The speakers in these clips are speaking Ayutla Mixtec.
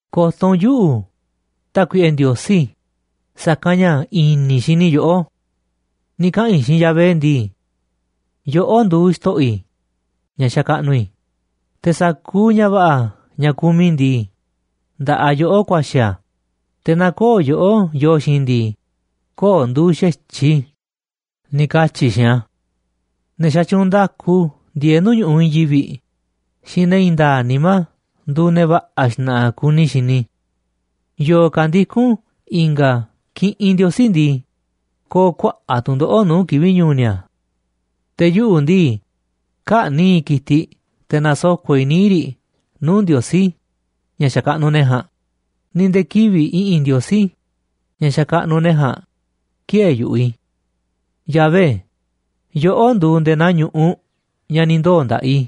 Ko̱to̱ u̱nꞌ yuꞌu̱, Tákuiꞌe Ndiosí, sa̱kanꞌ ña̱ i̱ni̱ i̱ xini i̱ yoꞌó. Ni̱ kaꞌa̱n i̱ xiinꞌ Yahvé ndii: “Yoꞌó nduuꞌ xto̱ꞌo̱ i̱, ña̱ xakaꞌnuꞌ i̱, te̱ sa̱kuuꞌ ña̱ va̱ꞌa̱ ña̱ kumiꞌ i̱ ndii, nda̱ꞌaꞌ yoꞌó ku̱a̱xi̱ a̱, te̱ naaꞌ köo̱ꞌ yoꞌó yoo xiinꞌ i̱ ndii, köo̱ꞌ nduuꞌ xa̱tyiꞌ i̱”, ni̱ katyi̱ i̱ xiinꞌ a̱. Ne̱ xatyuunꞌ nda̱ku ndieeꞌ nuu̱ꞌ ñu̱ꞌuꞌ i̱i̱n yivi̱ꞌ xiinꞌ ne̱ i̱i̱n nda̱a̱ꞌ nimá nduuꞌ ne̱ va̱ꞌa̱ xna̱ꞌa̱ kuni i̱ xini i̱. Yo̱o̱ ka̱ ndikún i̱nga̱ kiꞌinꞌ ndiosí ndii, ko̱o̱ kuaꞌa̱ꞌ tu̱ndoꞌo̱ꞌ nuu̱ꞌ kivi̱ꞌ ñu̱u̱ ni̱a̱. Te̱ yuꞌu̱ ndii, kä̱ꞌni̱ꞌ i̱ ki̱tiꞌ te̱ na̱soko̱ꞌ i̱ níiꞌ riꞌ nuu̱ꞌ ndiosí, ña̱ xakaꞌnuꞌ ne̱ ja̱a̱nꞌ, ni̱ nde̱e̱ kivi̱ꞌ i̱ꞌi̱n ndiosí, ña̱ xakaꞌnuꞌ ne̱ ja̱a̱nꞌ, ki̱ë̱e̱ yu̱ꞌuꞌ i̱. Yahvé, yoꞌó nduuꞌ nde̱e̱ naa ñu̱ꞌuꞌ ña̱ ni̱ ndoo̱ nda̱ꞌaꞌ i̱,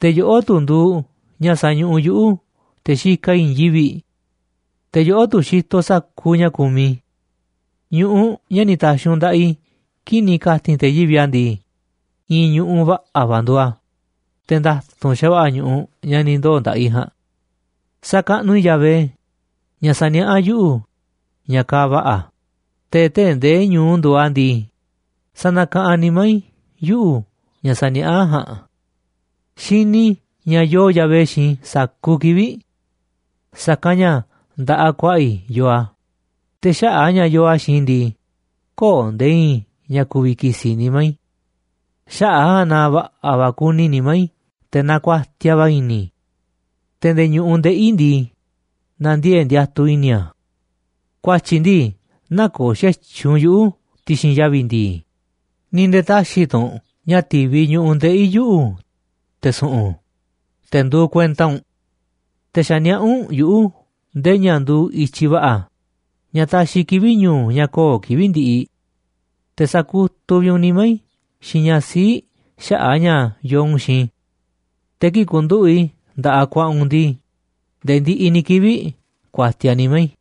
te̱ yoꞌó tu̱ nduuꞌ ña̱ sañuꞌuꞌ yuꞌu̱ te̱ xikaꞌ i̱ i̱i̱n yivi̱ꞌ. Te̱ yoꞌó tu̱ xitoꞌ sa̱kuuꞌ ña̱ kumiꞌ i̱. Ñu̱ꞌuꞌ, ña̱ ni̱ ta̱xi̱ u̱nꞌ nda̱ꞌaꞌ i̱ kii̱ꞌ ni̱ ka̱ti̱n te̱ yivi̱ꞌ a̱ ndii, i̱i̱n ñu̱ꞌuꞌ va̱ꞌa̱ va̱ nduuꞌ a̱, te̱ nda̱tu̱nꞌ xa̱va̱ꞌa̱ ñu̱ꞌuꞌ ña̱ ni̱ ndoo̱ nda̱ꞌaꞌ i̱ ja̱a̱nꞌ. Sakaꞌnuꞌ i̱ Yahvé, ña̱ saniaꞌá yuꞌu̱ ña̱ kaaꞌ va̱ꞌa̱, te̱ tee̱ꞌ nde̱e̱ ñu̱u nduuꞌ a̱ ndii, sanakaꞌanꞌ nimá i̱ yuꞌu̱ ña̱ saniaꞌá ja̱a̱nꞌ. Xini i̱ ña̱ yoo Yahvé xiinꞌ i̱ sa̱kuuꞌ kivi̱ꞌ. Sa̱kanꞌ ña̱ nda̱ꞌaꞌ ku̱a̱ꞌa̱ i̱ yoo a̱, te̱ xaꞌa̱ꞌ a̱ ña̱ yoo a̱ xiinꞌ i̱ ndii, kö̱o̱ nde̱e̱ i̱i̱n ña̱ ku̱vi̱ ki̱si̱ nimá i̱. Xaꞌa̱ꞌ a̱ ja̱a̱nꞌ na va̱ꞌa̱ va̱ kuni nimá i̱, te̱ nakuatiaꞌ va̱ i̱ni̱ i̱. Te̱ nde̱e̱ ñu̱ꞌuꞌ ndeꞌi̱ i̱ ndii, na̱ndiee̱ꞌ ndiatuꞌ i̱ni̱ a̱. Ku̱a̱tyi̱ ndii nä̱ko̱o̱ xa̱tyiꞌ u̱nꞌ yuꞌu̱ ti̱xi̱n yavi̱ ndi̱i̱, ni̱ nde̱e̱ tä̱xi̱ tu̱ u̱nꞌ ña̱ ti̱viꞌ ñu̱ꞌuꞌ ndeꞌi̱ yuꞌu̱, te̱ su̱ꞌu̱n, te̱ nduuꞌ kuenta u̱nꞌ. Te̱ xa̱ niaꞌá u̱nꞌ yuꞌu̱ nde̱e̱ ña̱ nduuꞌ i̱tyiꞌ va̱ꞌa̱, ña̱ taxiꞌ kivi̱ꞌ ñu̱u̱ ña̱ kö̱o̱ kivi̱ꞌ ndiꞌiꞌ. Te̱ sa̱kutuꞌ vi̱ꞌ u̱nꞌ nimá i̱ xiinꞌ ña̱ sii̱ꞌ xaꞌa̱ꞌ a̱ ña̱ yoo u̱nꞌ xiinꞌ i̱. Te̱ kii̱ꞌ ku̱nduꞌu̱ꞌ i̱ nda̱ꞌaꞌ ku̱a̱ꞌa̱ u̱nꞌ ndii, nde̱e̱ ndiꞌiꞌ ni̱ kivi̱ꞌ ku̱a̱tiaꞌ nimá i̱.